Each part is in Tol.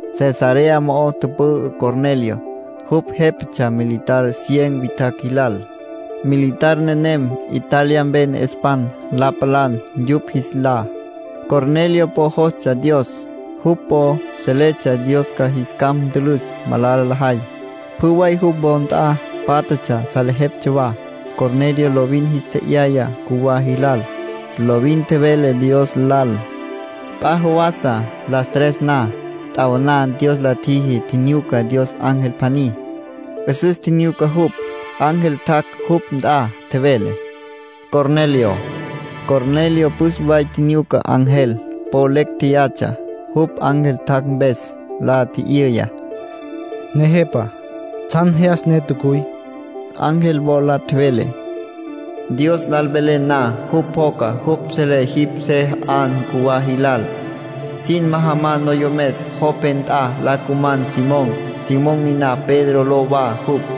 Cesarea mo'o tüpü'ü Cornelio. Jupj jépatsja militar cien witjacj jilal. Militar nenem “Italia Mpe Ne'espan La Palan” yupj jis lá. Cornelio po jostsja Dios. Jupj po seletsja Dios ca jis capj ntülüs malala lajay. Pjü way jupj wo nt'a pátjatsja salejeptsja wa. Cornelio lovin jis tje'yaya cjuwá jilal. Lovin tjevele Dios lal. P'a jawasa las tres na, t'awaná, Dios la tjiji tjinyuca Dios ángel pjaní. 'Üsüs tjinyuca jupj. Ángel tjac' jupj nt'a, tjevele: —¡Cornelio! Cornelio püs way tjinyuca ángel. Po lecj jéyatsja jupj ángel tjac' mpes. La tji'yüya: —Nejepa, ¿tsjan jyas ne tjacuy? Ángel wola tjevele: —Dios lal velen na, jupj pjoca. Jupj selé jipj se 'an cjuwá jilal. Sin majaman noyomes Jope nt'a la cuman Simón. Simón niná Pedro ló wa jupj.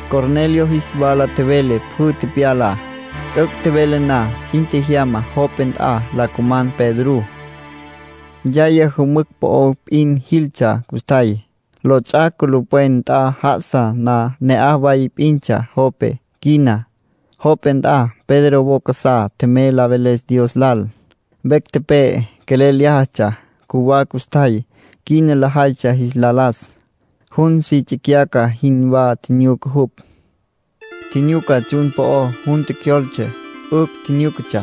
Cornelio jis wala tjevele pjü tepyalá. T'üc' tjevele na, sin tjejyama Jope nt'a la cuman Pedrú. Yaya jümücj po'o p'in jiltsja custjay. Lots'ac' culupwen nt'a já'asa na ne'aj way p'intsja Jope. Quina, Jope nt'a, Pedro wo casá tjemey la veles Dios lal. Vecj tepe'e, quelel lyájatsja. Cjuwá custjay, quina lajaytsja jis la las. Jun si tsicyaca jinwá tjinyuca jupj. Tjinyuca tsjun po'ó jun tjecjyoltse, 'ücj tjinyúcatsja.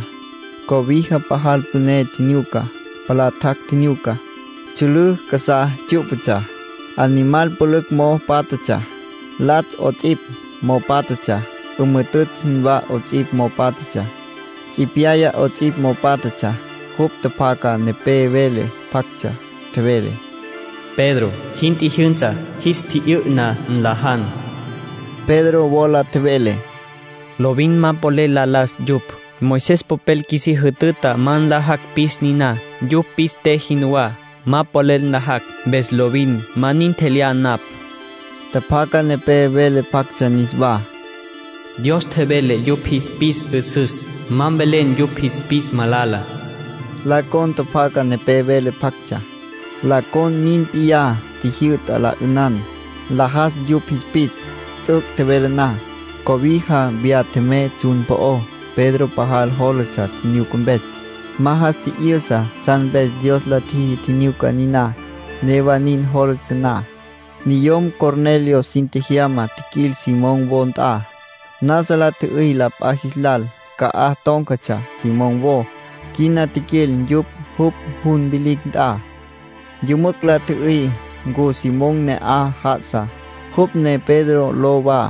Cobija pajal püné tjinyuca. Palá tjac' tjinyuca. Tsjülǘ casá tsyú'patsja. Animal pülücj mo'o pátjatsja. Latsj 'ots'ipj mo'o pátjatsja. 'Ümüjütütj jinwá 'ots'ipj mo'o pátjatsja. Tsipyaya 'ots'ipj mo'o pátjatsja. Jupj tjapjaca nepé vele pjactsja. Tjevele: —Pedro, jin tjijyünsa. Jis tji'yü'na, nlajan. Pedro wola tjevele: —Lovin ma polel la las yupj. Moisés popel qjuisí jütüta ma nlajacj pis niná. Yupj pis te jinwá, ma polel nlajacj, mpes lovin ma nin tjelyá napj. Tjapjaca nepé vele pjactsja niswá: —Dios tjevele yupj jis pis 'üsüs. Ma mvelen yupj jis pis malala —nin tjevele. La con tjapjaca nepé vele pjactsja. La con nin p'iyá tjijyü'ta la 'ünan, nlajas yupj jis pis. T'üc' tjevele na, cobija viyá tjemey tsjun po'ó. Pedro pajal jólatsja tjinyuca mpes. Ma jas tji'yüsa tsjan mpes Dios la tjiji tjinyuca niná. Newa nin jólatsja na, niyom Cornelio sin tjejyama tjiquil Simón wo nt'a. Nasa la tjü'üy la p'a jis lal ca'aj tón̈catsja Simón wo. Quina tjiquil yupj jupj jun vilicj nt'a. Yümücj la tjü'üy ncu Simón ne'aj já'asa, jupj ne Pedro ló wa.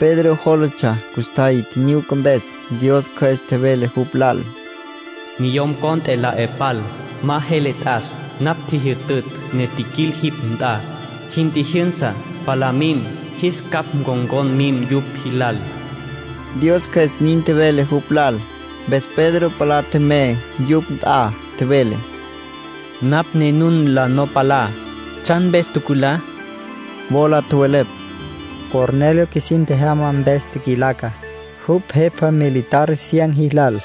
Pedro jólatsja custjay tjinyuca mpes. Dios Cjües tjevele jupj lal: “Niyom cont'e la 'e pal. Ma jele t'as. Napj tjijyütütj, ne tjiquil jipj nt'a. Jin tjijyünsa, palá mim, jis capj ncon̈con mim yupj jilal”, Dios Cjües nin tjevele jupj lal. Mpes Pedro palá tjemey yupj nt'a. Tjevele: —Napj ne nun la no palá. ¿Tsjan mpes tjuculá? —la tji'yüya. Wola tjowelepj: —Cornelio qjuisin tjejyama mpes tjiquilaca. Jupj jepa, militar cien jilal.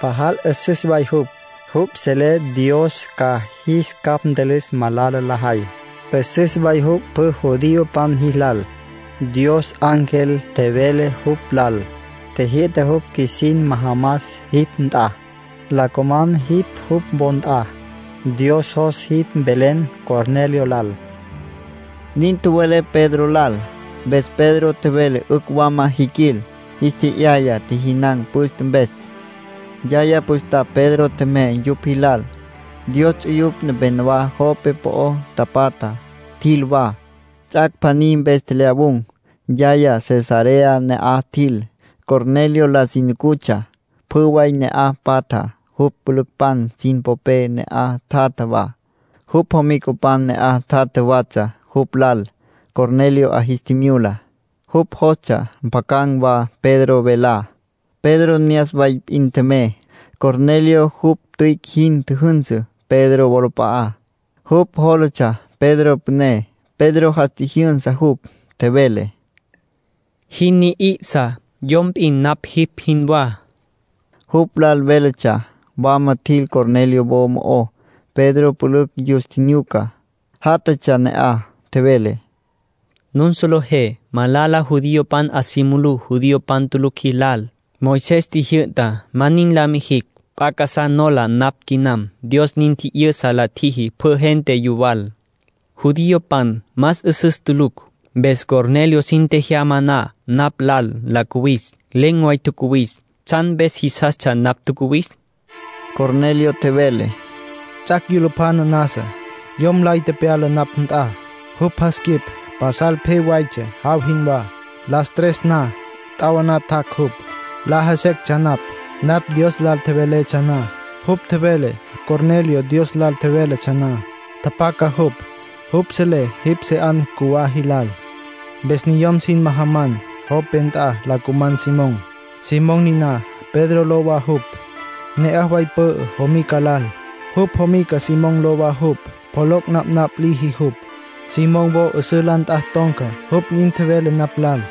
Pajal 'üsüs way jupj. Jupj selé Dios ca jis capj ntülüs malala lajay. 'Üsüs way jupj pjü judiopan jilal. Dios ángel tjevele jupj lal. Tjijyü'ta jupj qjuisin majamas jipj nt'a, la cuman jipj jupj wo nt'a. Dios jos jipj mvelen Cornelio lal —nin tjowelepj Pedro lal. Mpes Pedro tjevele 'ücj wama jiquil. Jis tje'yaya tjijinan̈ püste mpes. Yaya püstapj Pedro tjemey yupj jilal. Dios ts'uyupj nepenowá Jope po'o tapatja tjil wa. Ts'ac' pjaní mpes tjelyawun̈. Yaya Cesarea ne'aj tjil. Cornelio la si nucutsja. Pjü way ne'aj patja jupj jüpülücpan sin popé ne'aj tjatja wa. Jupj jomicapan ne'aj tjatja watsja jupj lal. Cornelio 'a jis tjimyula. Jupj jostsja mpjacan̈ wa Pedro velá. Pedro ne'as way p'in tjemey, Cornelio jupj tüic' jin tjüjünsü Pedro wolap'a'á. Jupj jólatsja Pedro püné. Pedro jas tjijyünsa jupj. Tjevele: —Jin ni'isa. Yom p'in napj jipj jinwá. Jupj lal véletsja. Wama tjil Cornelio wo mo'ó. Pedro pülücj yus tjinyuca, játjatsja ne'aj. Tjevele: —Nun solejé malala judiopan 'a si mulú judiopan tulucj jilal. Moisés tjijyü'ta ma nin la mijicj. P'a casá nola napj quinam. Dios nin tji'yüsa la tjiji pjü gente yuwal. Judiopan más 'üsüs tulucj. Mpes Cornelio sin tjejyama na napj lal la cuwis, len̈ way tjacuwis. ¿Tsjan mpes jisastsja napj tjacuwis? —Pedro la tji'yüya. Cornelio tjevele: —Ts'ac' yulupjana nasa, yom lay tepyala napj nt'a. Jupj jas quip pasal pje waytsja, jaw jinwá. Las tres na, t'awaná, tjac' jupj. Laja sectsja napj, napj Dios lal tjeveletsja na. Jupj tjevele: ‘Cornelio, Dios lal tjevelentsja na, tjapjaca jupj. Jupj selé jipj se 'an cjuwá jilal. Mpes niyom sin majaman Jope nt'a la cuman Simón. Simón niná Pedro ló wa jupj. Ne'aj way pü'ü jomica lal. Jupj jomica Simón ló wa jupj. Pjoloc' napnapj liji jupj. Simón wo 'üsǘ la nt'a ton̈ca’, jupj nin tjevele napj lal.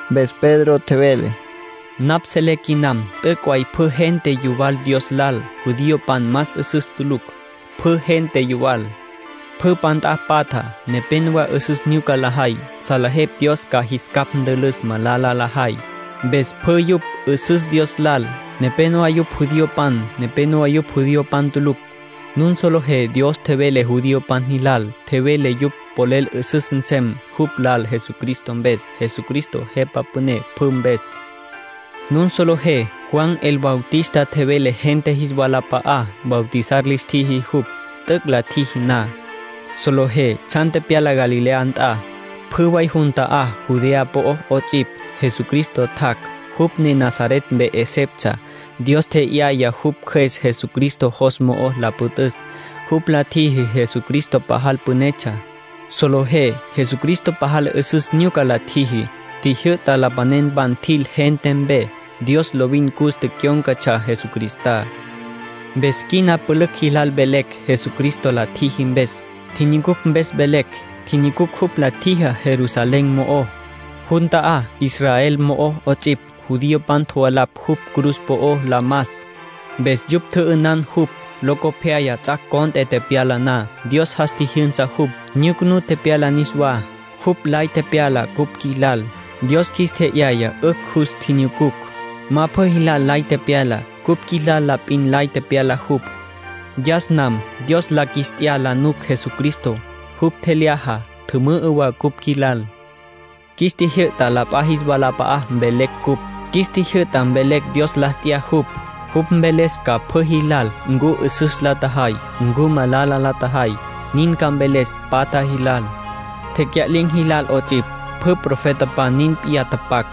Mpes Pedro tjevele: —Napj selé quinam t'üc' way pjü gente yuwal Dios lal. Judiopan más 'üsüs tulucj. Pjü gente yuwal. Pjü p'a nt'a patja, nepenowá 'üsüs nyuca lajay. Salejepj Dios ca jis capj ntülüs malala lajay. Mpes pjü yupj 'üsüs Dios lal. Nepénowa yupj judiopan. Nepénowa yupj judiopan tulucj. Nun solejé Dios tjevele judiopan jilal. Tjevele yupj polel 'üsüs nsem jupj lal Jesucristo mpes. Jesucristo Jepa Püné pjü mpes. Nun solejé Juan el Bautista tjevele gente jis walap'a'á, bautizar lis tjiji jupj. T'üc' la tjiji na, solejé tsjan tepyala Galilea nt'a, pjü way jun ta'á Judea po'ó 'ots'ipj. Jesucristo tjac', jupj ne Nazaret mpe 'eseptsja. Dios tje'yaya jupj Cjües Jesucristo jos mo'o la püt'üs. Jupj la tjiji Jesucristo pajal pünetsja. Solejé Jesucristo pajal 'üsüs nyuca la tjiji. Tjijyü'ta lapanenpan tjil gente mpe. Dios lovin cus tecyón̈catsja Jesucristá. ”Mpes quina pülücj jilal velecj Jesucristo la tjiji mpes. Tjinyucucj mpes velecj. Tjinyucucj jupj la tjijá Jerusalén mo'ó, jun ta'á Israel mo'ó 'ots'ipj. Judiopan tjovalapj jupj cruz po'ó la mas. Mpes yupj tjü'ünan jupj. Locopyaya ts'ac' cont'e tepyala na, Dios jas tjijyünsa jupj, nyucunú tepyala niswá. Jupj lay tepyala cupj qjuilal. Dios qjuis tje'yaya 'ücj jus tjinyucucj. Ma pjü jilal lay tepyala. Cupj qjuilal la p'in lay tepyala jupj. Yas nam Dios la qjuis t'ya la nuc Jesucristo. Jupj tjelyaja, tjümü'ü wa cupj qjuilal. Qjuis tjijyü'ta la p'a jis walap'a'a mvelecj cupj. Qjuis tjijyü'ta mvelecj Dios la t'ya jupj, jupj mveles ca pjü jilal ncu 'üsüs la tjajay, ncu malala la tjajay. Nin ca mveles patja jilal, tecya'lin̈ jilal 'ots'ipj. Pjü profetapan nin p'iyá tapac.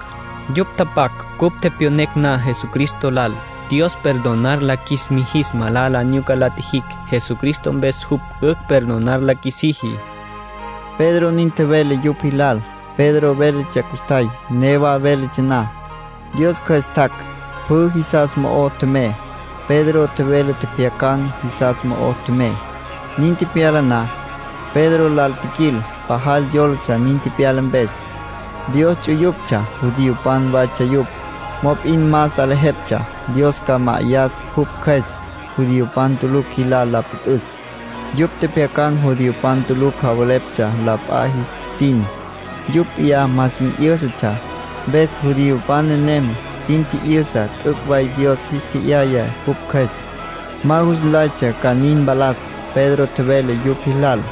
Yupj tapac cupj tepyonecj na Jesucristo lal, Dios perdonar la qjuis mijis malala nyuca la tjijicj. Jesucristo mpes jupj 'ücj perdonar la qjuisiji —Pedro nin tjevele yupj jilal. Pedro véletsja custjay. Newa véletsja na, Dios Cjües tjac', pjü jisas mo'o tjemey, Pedro tjevele tjepjyacan̈ jisas mo'o tjemey. Nin tepyala na, Pedro lal tjiquil pajal yólatsja nin tepyala mpes. Dios ts'uyuptsja judiopan waytsja yupj. Mop'in ma salejeptsja Dios ca ma'ayas jupj Cjües judiopan tulucj jilal la püt'üs. Yupj tjepjyacan̈ judiopan tulucj javeleptsja la p'a jis tin, yupj p'iyá ma sin 'yǘsatsja. Mpes judiopan nenem sin tji'yüsa t'üc' way Dios jis tje'yaya jupj Cjües. Ma jus nlaytsja ca nin mpalas. Pedro tjevele yupj jilal: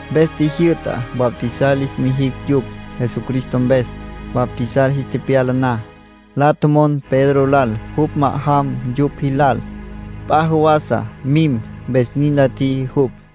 Mpes tjijyü'ta bautizar lis mijicj yupj, Jesucristo mpes. Bautizar jis tepyala na, la tjomon Pedro lal jupj ma'ajam yupj jilal, p'a jawasa mim. Mpes nin la tjiji jupj.